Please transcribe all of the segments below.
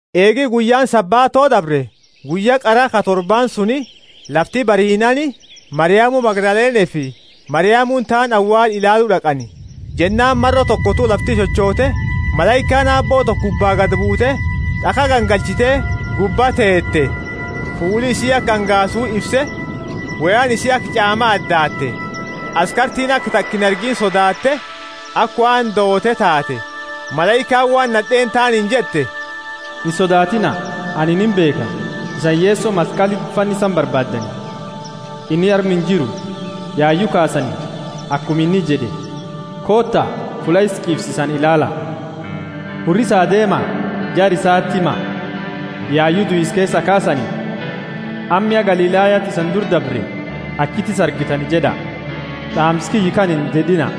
Eegi guyyaani Sabato dabre, guyya qara ka torbaani suni, lafti bariinaani Mariamu Magdalenefi Mariamuni taani awaala ilaalu d'aqani. Jennaani maro tokotu lafti chochote, malaikaani Aabbo toko gubba gadi buute, d'akha gangalchite gubba teete. Fuuli isii aka angaasu ifse, woyaani isii aka ch'aama adaatte. Askartiini aka taka inargiini sodaatte, aka waan doote taate. Malaikaani waan nad'eeni taaniini jette, Insodaatiina; anini imbeekha, isani Yeso maskaliti fannisani barbaaddani. Inni arma injiru, yayu kaasani, akuma inni jed'e. Koota, fulla isa ch'iifsisani ilaala. Hurrisa, deema jara isaati hima: Yayu duisa keesaa kaasani, amma ya Galilayati isani dura dabre; achiti isa argitani jed'a. D'aamsa kiyya kana inded'ina.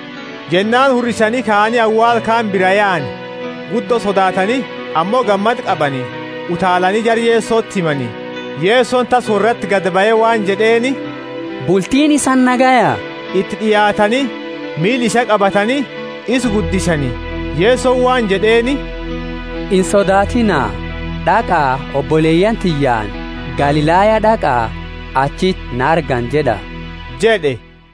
Jennaani hurrisani kaani, awaala kaani biraa yaani, guddo sodaatani, ammo gammada qabani, utaalani jara Yesoti himani. Yesoni tassa worrati gadi bahe waan jed'eeni, Bultiini isani nagaya? Iti d'iaatani, miila isaa qabatani isa guddisani. Yesoni waan jed'eeni, Insodaatiina, d'aqa oboleyaani tiyyaani, Galilaya d'aqa achiti na argani jed'a jed'e.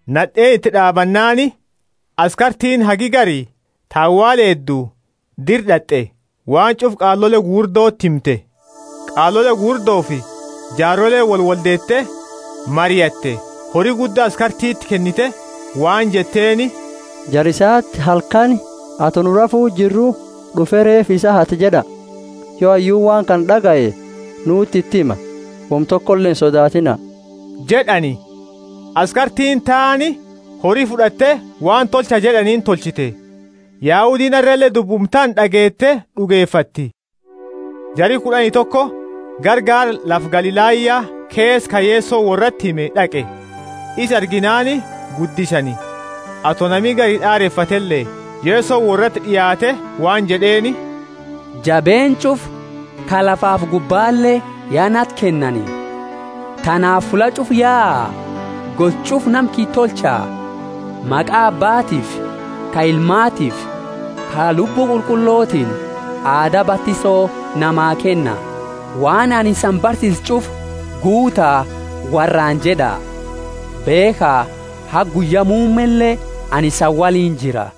Nad'eeni iti d'aabannaani, askartiini hagi gari ta awaala eeddu dira d'at'e, waan ch'ufa qaalole gugurdoti himte. Qaalole gugurdofi jaaroleeni woliwoldeete mariatte, hori gudda askartiti kennite waan jetteeni, Jara isati halkani, ato nu rafu jirru, d'ufe reefa isa hate jed'a. Yo hayyuuni waan kana d'agaye, nuti iti hima, woma tokole insodaatiina jed'ani. Askartiini taani hori fud'atte, waan tolcha jed'aniini tolchite. Yahudiini arrale dubbuma tana d'ageete d'ugefatti. Jari kud'ani toko gara gaara lafa Galilaya keesa, ka Yesoni worrati hime d'aqe. Isa arginaani guddisani, ato nami gari d'arefatele. Yesoni worrati d'iaate waan jed'eeni: Jabeenna ch'ufa, ka lafafi gubbale, ya nati kennani. Tanaafi fulla ch'ufa yaa, gosa ch'ufa nama kiyya tolcha: maqa Abbaatiifi ka ilmaatiifi ka Lubbu Qulqullotini aada batiso namaa kenna, waan anini isani barsiise ch'ufa guuta worraani jed'a. Beekha, haga guyya muummele anini isani woliini jira.